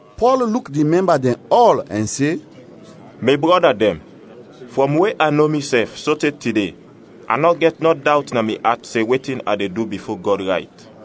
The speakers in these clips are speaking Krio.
Pɔl luk di mɛmba dɛn ɔl ɛn se, “Mi brɔda dɛn, frɔm we a no misɛf sote tide, a nɔ gɛt nɔ dawt na mi at se wetin a de du bifo Gɔd, rayt.”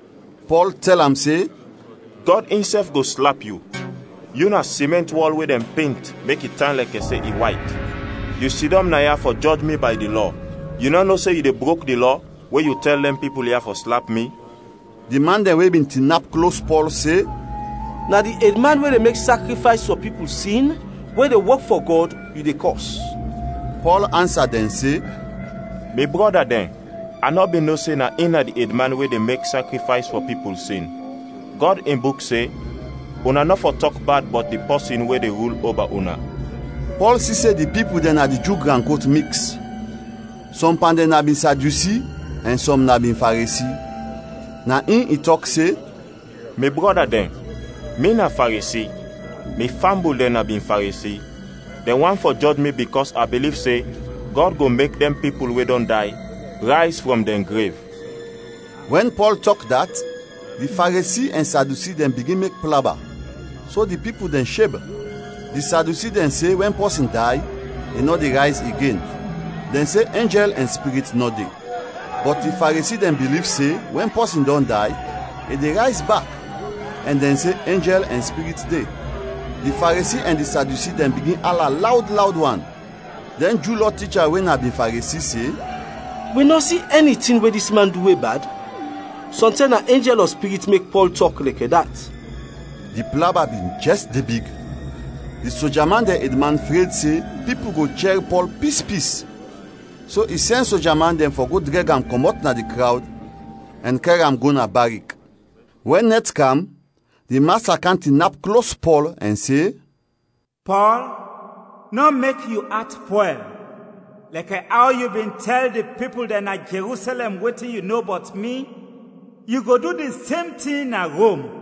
Pɔl tɛl am se, “Gɔd insɛf go slap yu; yu na simɛnt wɔl we dɛn pent mek i tan lɛkɛ se i wayt! Yu sidɔm naya fɔ jɔj mi bay di Lɔ, yu nɔ no se yu de brok di Lɔ we yu tɛl dɛn pipul ya fɔ slap mi?” Di man dɛn we bin tinap klos Pɔl se, “Na di edman we de mek sakrifays fɔ pipul sin, we de wok fɔ Gɔd, yu de kɔs!” Pɔl ansa dɛn se, “Mi brɔda dɛn, a nɔ bin no se na in na di edman we de mek sakrifays fɔ pipul sin. Gɔd in Buk se, ‘Una nɔ fɔ tɔk bad bɔt di pɔsin we de rul oba una.’” Pɔl si se di pipul dɛn na di Ju gran kot miks; sɔm pan dɛn na bin Sadyusi ɛn sɔm na bin Faresi. Na in i tɔk se, “Mi brɔda dɛn, mi na Faresi, mi fambul dɛn na bin Faresi. Dɛn want fɔ jɔj mi bikɔs a biliv se Gɔd go mek dɛn pipul we dɔn day, rayz frɔm dɛn grev.” Wɛn Pɔl tɔk dat, di Faresi ɛn Sadyusi dɛn bigin mek plaba, so di pipul dɛn sheb. Di Sadyusi dɛn se wɛn pɔsin day, i nɔ de rayz igen. Dɛn se enjɛl ɛn spirit nɔ de; bɔt di Faresi dɛn biliv se wɛn pɔsin dɔn day, i de rayz bak ɛn dɛn se enjɛl ɛn spirit de. Di Faresi ɛn di Sadyusi dɛn bigin ala lawd lawd wan. Dɛn Ju Lɔ ticha we na bin Faresi se, “Wi nɔ si ɛni tin we dis man du we bad! Sɔntɛm na enjɛl ɔ spirit mek Pɔl tɔk lɛkɛ dat!” Di plaba bin jɛs de big, di soja man dɛn edman fred se pipul go chɛr Pɔl pispis, so i sɛn soja man dɛn fɔ go drɛg am kɔmɔt na di krawd ɛn kɛr am go na barik. Wɛn nɛt kam, di Masta kam tinap klos Pɔl ɛn se, “Pɔl, nɔ mek yu at pwɛl; lɛkɛ aw yu bin tɛl di pipul dɛn na Jerusɛlɛm wetin yu no bɔt mi, yu go du di sem tin na Rom.”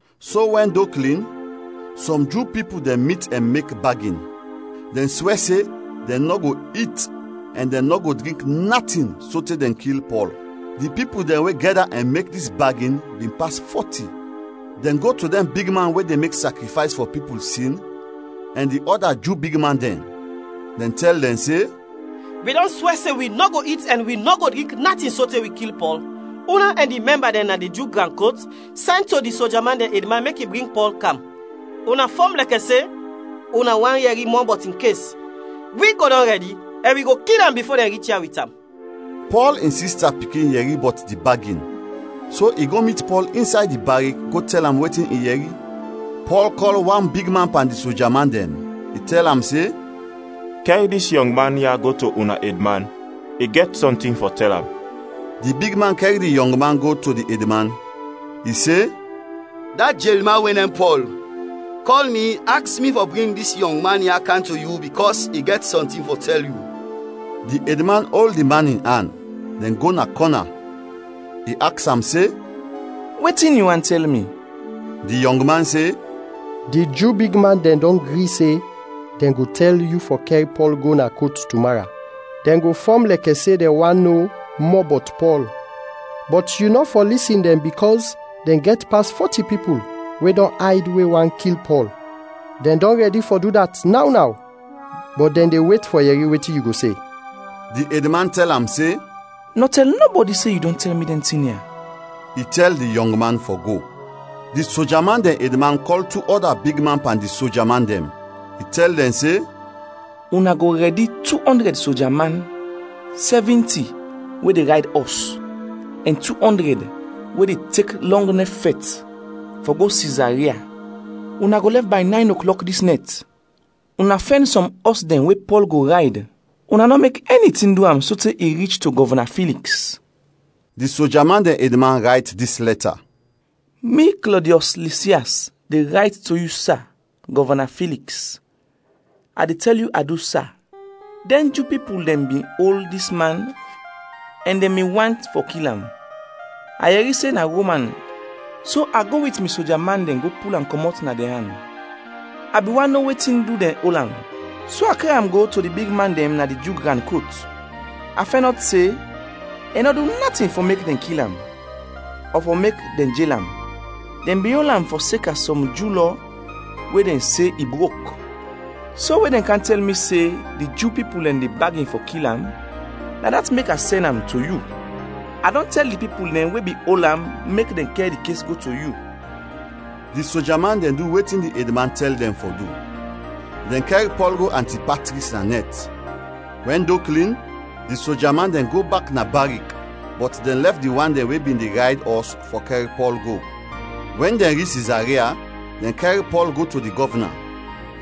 So wɛn do klin, sɔm Ju pipul dɛn mit ɛn mek bagin. Dɛn swɛ se dɛn nɔ go it ɛn dɛn nɔ go drink natin sote dɛn kil Pɔl. Di pipul dɛn we gɛda ɛn mek dis bagin bin pas fɔti. Dɛn go to dɛn bigman we de mek sakrifays fɔ pipul sin ɛn di ɔda Ju bigman dɛn; dɛn tɛl dɛn se, “Wi dɔn swɛ se wi nɔ go it ɛn wi nɔ go drink natin sote wi kil Pɔl. Una ɛn di mɛmba dɛn na di Ju gran kot, sɛn to di soja man dɛn edman mek i bring Pɔl kam. Una fɔm lɛkɛ se una want yɛri mɔ bɔt in kes; wi go dɔn rɛdi ɛn wi go kil am bifo dɛn rich ya wit am.” Pɔl in sista pikin yɛri bɔt di bagin so i go mit Pɔl insay di barik go tɛl am wetin i yɛri. Pɔl kɔl wan bigman pan di soja man dɛn, i tɛl am se, “Kɛr dis yɔngman ya go to una edman, i gɛt sɔntin fɔ tɛl am.” Di bigman kɛr di yɔngman go to di edman, i se, “Da jelman we nem Pɔl, kɔl mi aks mi fɔ bring dis yɔngman ya kam to yu bikɔs i gɛt sɔntin fɔ tɛl yu.” Di edman ol di man in an, dɛn go na kɔna. I aks am se, “Wetin yu want tɛl mi?” Di yɔngman se, “Di Ju bigman dɛn dɔn gri se dɛn go tɛl yu fɔ kɛr Pɔl go na kot tumara. Dɛn go fɔm lɛkɛ se dɛn want no mɔ bɔt Pɔl. Bɔt yu nɔ fɔ lisin dɛn bikɔs dɛn gɛt pas fɔti pipul we dɔn ayd we want kil Pɔl. Dɛn dɔn rɛdi fɔ du dat naw naw, bɔt dɛn de wet fɔ yɛri wetin yu go se.” Di edman tɛl am se, “Nɔ tɛl nɔbɔdi se yu dɔn tɛl mi dɛn tin ya.” I tɛl di yɔngman fɔ go. Di soja man dɛn edman kɔl tu ɔda bigman pan di soja man dɛn; i tɛl dɛn se, “Una go rɛdi tu ɔndrɛd soja man, sɛvinti we de rayd ɔs, ɛn tu ɔndrɛd we de tek lɔng nɛf fɛt, fɔ go Sizaria. Una go lɛf bay nayn oklɔk dis nɛt. Una fɛn sɔm ɔs dɛn we Pɔl go rayd; una nɔ mek ɛni tin du am sote i rich to Gɔvna Filiks.” Di soja man dɛn edman rayt dis lɛta: “Mi, Klɔdiɔs Lisias de rayt to yu sa, Gɔvna Filiks. A de tɛl yu adu, sa! Dɛn Ju pipul dɛn bin ol dis man ɛn dɛn bin want fɔ kil am. A yɛri se na Roman so a go wit mi soja man dɛn go pul am kɔmɔt na dɛn an. A bin want no wetin du dɛn ol am, so a kɛr am go to di bigman dɛn na di Ju gran kot. A fɛnɔt se i nɔ du natin fɔ mek dɛn kil am ɔ fɔ mek dɛn jel am. Dɛn bin ol am fɔseka sɔm Ju Lɔ we dɛn se i brok. So we dɛn kam tɛl mi se di Ju pipul dɛn de bagin fɔ kil am, na dat mek a sɛn am to yu. A dɔn tɛl di pipul dɛn we bin ol am mek dɛn kɛr di kes go to yu.” Di soja man dɛn du wetin di edman tɛl dɛn fɔ du. Dɛn kɛr Pɔl go Antipatris na nɛt. Wɛn do klin, di soja man dɛn go bak na barik bɔt dɛn lɛf di wan dɛn we bin de rayd ɔs fɔ kɛr Pɔl go. Wɛn dɛn rich Sizaria, dɛn kɛr Pɔl go to di gɔvna,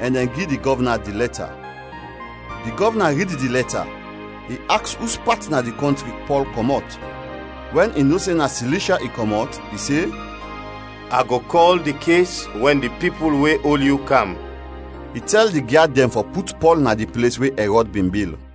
ɛn dɛn gi di gɔvna di lɛta. Di gɔvna rid di lɛta, i aks uspat na di kɔntri Pɔl kɔmɔt. Wɛn i no se na Silishya i kɔmɔt, i se, “A go kɔl di kes wɛn dɛn pipul we ol yu kam.” I tɛl di gyad dɛn fɔ put Pɔl na di ples we Ɛrɔd bin bil.